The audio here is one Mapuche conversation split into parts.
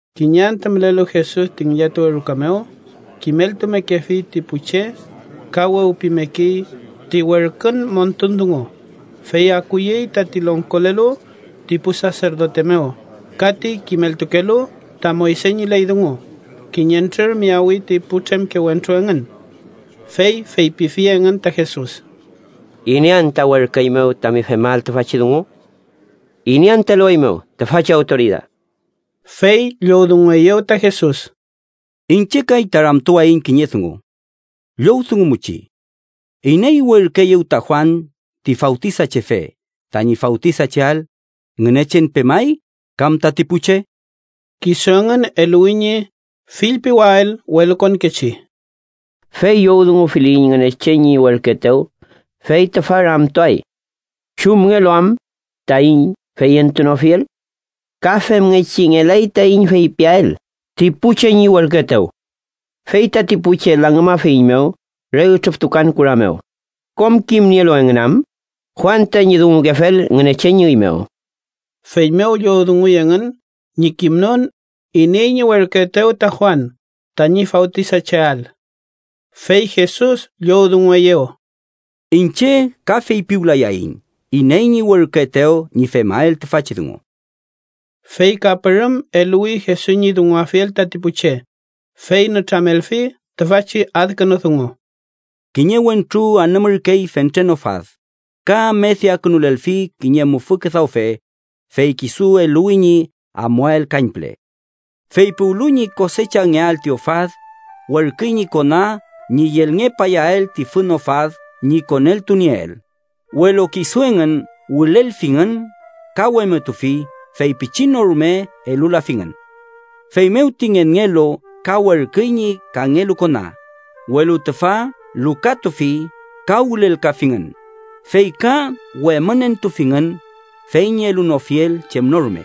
Kiñe antü mülelu Jesus ti ngillatuwe ruka mew, kimeltumekefi ti pu che ka wewpimekey ti werkün montun dungu, fey akuyey tati longkolelu ti pu saserdote mew ka ti kimeltukelu ta Moyse ñi ley dungu, kiñentrür miyawi ti putremke wentru engün. Fey feypifi engün ta Jesus: —¿Iney anta werküeymew tami femael tüfachi dungu? ¿Iney anta elueymew tüfachi awtoridad? Fey llowdungueyew ta Jesus: —Iñche kay ta ramtuwayiñ kiñe dungu. Llowdungumuchi. ¿Iney werküeyew ta Juan ti Fawtisachefe tañi fawtisacheael, Ngünechen pemay kam tati pu che? Kisu engün eluwi ñi fillpiwael welukonkechi: “Fey llowdungufiliyiñ Ngünechen ñi werküetew, fey tüfa ramtuay: ¿chumngelu am taiñ feyentunofiel? Ka femngechi ngelay taiñ feypiael ti pu che ñi werküetew. Fey tati pu che langümafeiñmew re ütrüftukan kura mew, kom kimnielu engün am Juan tañi dungukefel Ngünechen ñi üy mew.” Feymew llowdunguy engün ñi kimnon iney ñi werküetew ta Juan tañi fawtisacheael. Fey Jesus llowdungueyew: —Iñche ka feypiwlayayiñ iney ñi werküetew ñi femael tüfachi dungu. Fey ka pürüm eluwi Jesus ñi dunguafiel tati pu che, fey nütramelfi tüfachi adkünu dungu: “Kiñe wentru anümürkey fentren ofad, ka amediakünulelfi kiñe mufü küdawfe, fey kisu eluwi ñi amuael kañpüle. Fey puwlu ñi kosechangeael ti ofad, werküy ñi kona ñi yelngepayael ti fün ofad ñi koneltunieel, welu kisu engün wülelfingün ka wemütufi fey pichin no rume elulafingün. Feymew ti ngenngelu ka werküy ñi kangelu kona, welu tüfa lukatufi ka wülelkafingün, fey ka wemünentufingün fey ñi elunofiel chem no rume.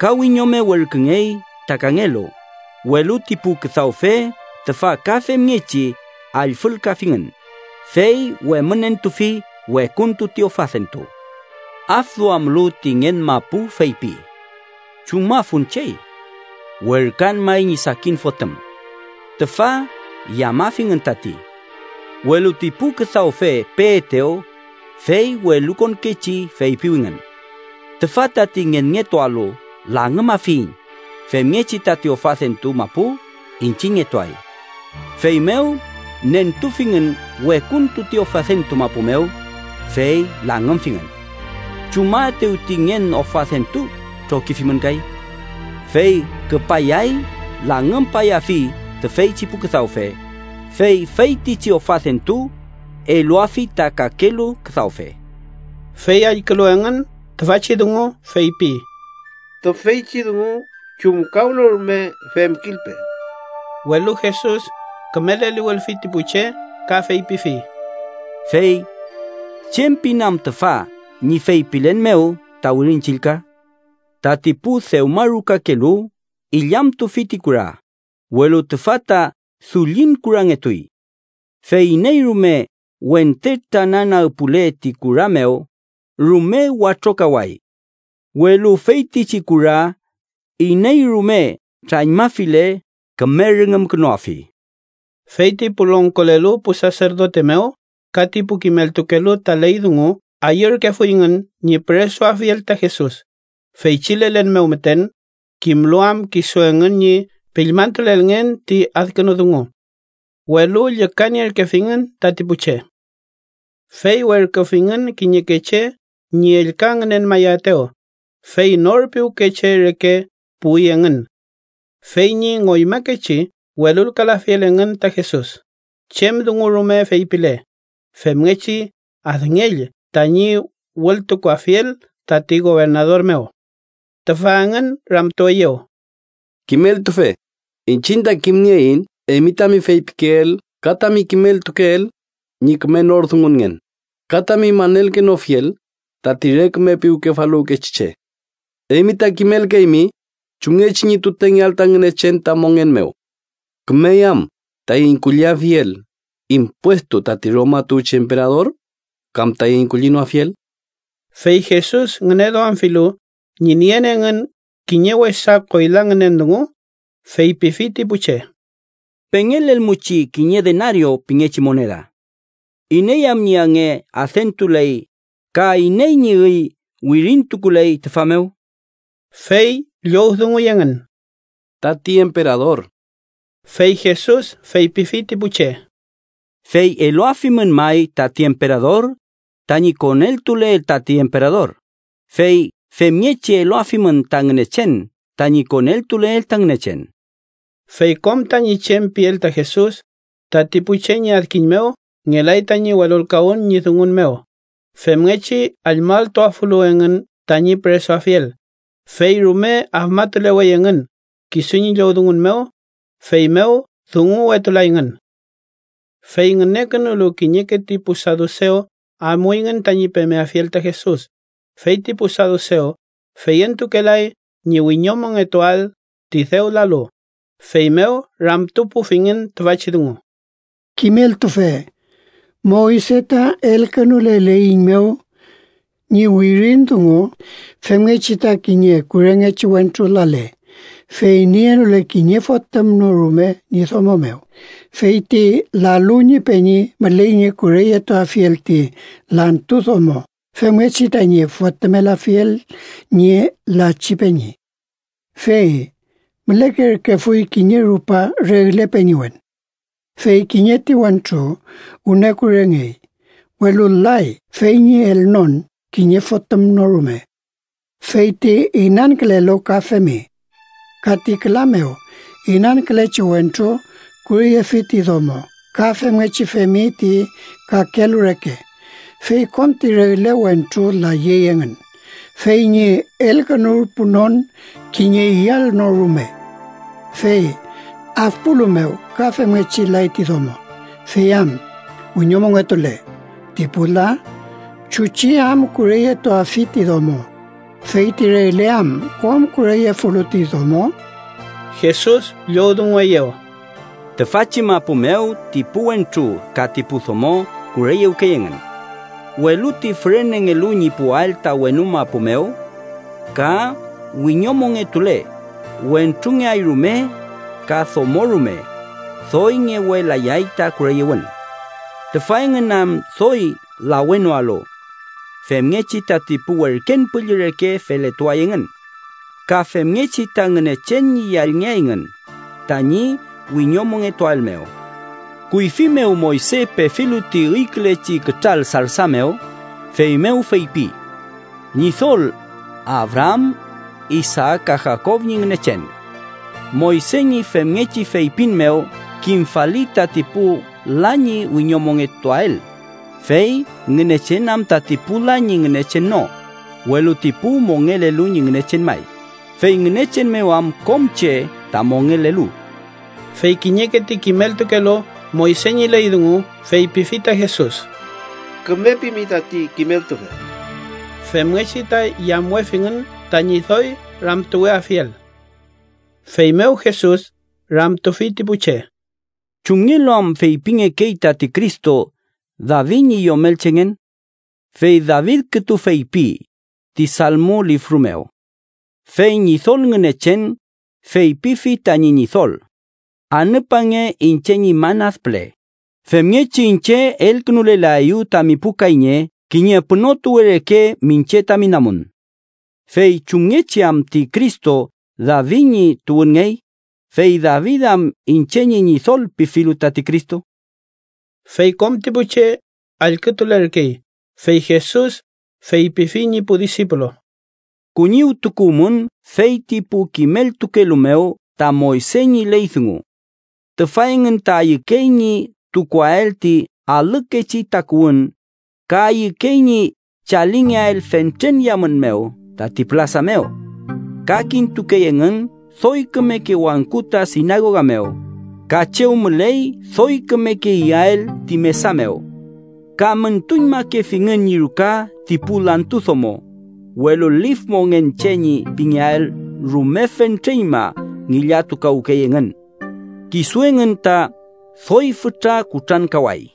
Ka wiñome werküngey ta kangelu, welu ti pu küdawfe tüfa ka femngechi allfülkafingün, fey wemünentufi wekuntu ti ofadentu. “Afduamlu ti ngen mapu feypi: ‘¿Chumafun chey? Werküan may ñi sakin fotüm. Tüfa yamafingün tati.’ Welu ti pu küdawfe peetew, fey welukonkechi feypiwingün: ‘Tüfa tati ngenngetualu langümafiyiñ, femngechi tati ofadentu mapu iñchiñngetuay.’ Feymew nentufingün wekuntu ti ofadentu mapu mew, fey langümfingün. “¿Chumaetew ti ngen ofadentu trokifimün kay? Fey küpayay langümpayafi tüfeychi pu küdawfe, fey feytichi ofadentu eluafi ta kakelu küdawfe.” Fey allkülu engün tüfachi dungu, feypi: —¡Tüfeychi dungu chumkawnorume femkilpe! Welu Jesus küme leliwülfi ti pu che ka feypifi: —Fey ¿chem pin am tüfa ñi feypilen mew ta Wirin Chillka? ‘Tati pu dewmarukakelu illamtufi ti kura, welu tüfa ta dullin kurangetuy.’ Fey iney rume wente trananagpuwle ti kura mew, rume watrokaway. Welu feytichi kura iney rume trañmafile küme rüngümkünuafi. Fey ti pu longkolelu pu saserdote mew ka ti pu kimeltukelu ta ley dungu ayürkefuyngün ñi püresuafiel ta Jesus, feychi lelen mew müten, kimlu am kisu engün ñi piñmaltulelngen ti adkünu dungu. Welu llükanierkefingün tati pu che. Fey werküfingün kiñeke che ñi ellka ngünenmayaetew, fey nor piwke che reke puwi engün. Fey ñi ngoymakechi welulkalafiel engün ta Jesus chem dungu rume feypile, femngechi adngell tañi wültukuafiel tati gobernador mew. Tüfa engün ramtueyew: —Kimeltufe, iñchiñ ta kimnieiñ eymi tami feypikeel ka tami kimeltukeel ñi küme nor dungungen ka tami manelkenofiel tati re küme piwkefaluwkechi che. Eymi ta kimelkeymi chumngechi ñi tutengeael ta Ngünechen ta mongen mew. ¿Kümey am taiñ kulliafiel impuestu tati Roma tuwchi emperador kam taiñ kullinoafiel? Fey Jesus ngüneduamfilu ñi nien engün kiñe wesa koyla ngünen dungu, feypifi ti pu che: —Pengelelmuchi kiñe denario pingechi moneda. ¿Iney am ñi ange adentuley ka iney ñi üy wirintukuley tüfa mew? Fey llowdunguy engün: —Tati emperador. Fey Jesus feypifi ti pu che: —Fey eluafimün may tati emperador, tañi koneltuleel tati emperador, fey femngechi eluafimün ta Ngünechen tañi koneltuleel ta Ngünechen. Fey kom tañi chem piel ta Jesus, tati pu che ñi adkiñ mew ngelay tañi welulkawün ñi dungun mew femngechi allmalltuafulu engün tañi püresuafiel, fey rume afmatulewey engün kisu ñi llowdungun mew, feymew dunguwetulayngün. Fey ngünekünulu kiñeke ti pu sadusew amuyngün tañi pemeafiel ta Jesus, fey ti pu sadusew feyentukelay ñi wiñomongetuael ti dew lalu, feymew ramtupufingün tüfachi dungu: —Kimeltufe, Moyse ta elkünuleleiñmew ñi wirin dungu femngechi ta kiñe kurengechi wentru lale, fey nienole kiñe fotüm no rume ñi domo mew, fey ti lalu ñi peñi müley ñi kureyetuafiel ti lantu domo femngechi tañi fotümelafiel ñi lachi peñi. Fey mülekerkefuy kiñe rupa regle peñiwen. Fey kiñe ti wentru wüne kurengey, welu lay fey ñi elnon kiñe fotüm no rume. Fey ti inankülelu ka femi. Ka ti küla mew inankülechi wentru kureyefi ti domo ka femngechi femi ti kakelu reke, fey kom ti regle wentru layey engün, fey ñi elkünurpunon kiñe yall no rume. Fey afpulu mew ka femngechi lay ti domo. Fey am wiñomongetule ti pu la ¿chuchi am kureyetuafi ti domo, fey ti regle am kom kureyefulu ti domo? Jesus llowdungueyew: —Tüfachi mapu mew ti pu wentru ka ti pu domo kureyewkey engün. Welu ti fürenengelu ñi puwael ta wenu mapu mew ka wiñomongetule, wentrungeay rume ka domo rume, doy ngewelayay ta kureyewün. Tüfa engün am doy lawenoalu. Femngechi tati pu werken püllü reke feletuay engün. Ka femngechi ta Ngünechen ñi yallngeayngün tañi wiñomongetuael mew. Kuyfi mew Moyse pefilu ti üykülechi kütral sarsa mew, feymew feypi: ‘Ñidol, Abraam, Isaak ka Jakob ñi Ngünechen.’ Moyse ñi femngechi feypin mew kimfali tati pu la ñi wiñomongetuael, fey ¡Ngünechen am tati pu la ñi Ngünechen no, welu ti pu mongelelu ñi Ngünechen may, fey Ngünechen mew am kom che ta mongelelu! Fey kiñeke ti kimeltukelu Moyse ñi ley dungu feypifi ta Jesus: —Küme pimi tati kimeltufe. Femngechi ta yamwefingün tañi doy ramtuweafiel. Feymew Jesus ramtufi ti pu che: —¿Chumngelu am feypingekey tati Cristo David ñi yomelchengen? Fey David kütu feypi, ti Salmo lifru mew: ‘Fey Ñidol Ngünechen feypifi tañi Ñidol: Anüpange iñche ñi man ad püle. Femngechi iñche elkünulelaeyu tami pu kayñe kiñe pünotuwe reke miñche tami namun.’ ¿Fey chumngechi am ti Cristo David ñi tuwünngey, fey David am iñche ñi Ñidol pifilu tati Cristo? Fey kom ti pu che allkütulerkey, fey Jesus feypifi ñi pu disipulu: “Kuñiwtukuwmün fey ti pu kimeltukelu mew ta Moyse ñi ley dungu. Tüfa engün ta ayükey ñi tukuael ti alükechi takuwün ka ayükey ñi chalingeael fentren yamün mew tati pülasa mew. Ka kintukey engün doy kümeke wangku ta sinagoga mew, ka chew müley doy kümeke iyael ti mesa mew. Ka müntuñmakefingün ñi ruka ti pu lantu domo, welu lif mongen che ñi pingeael rume fentreñma ngillatukawkey engün. Kisu engün ta doy fütra kutrankaway.”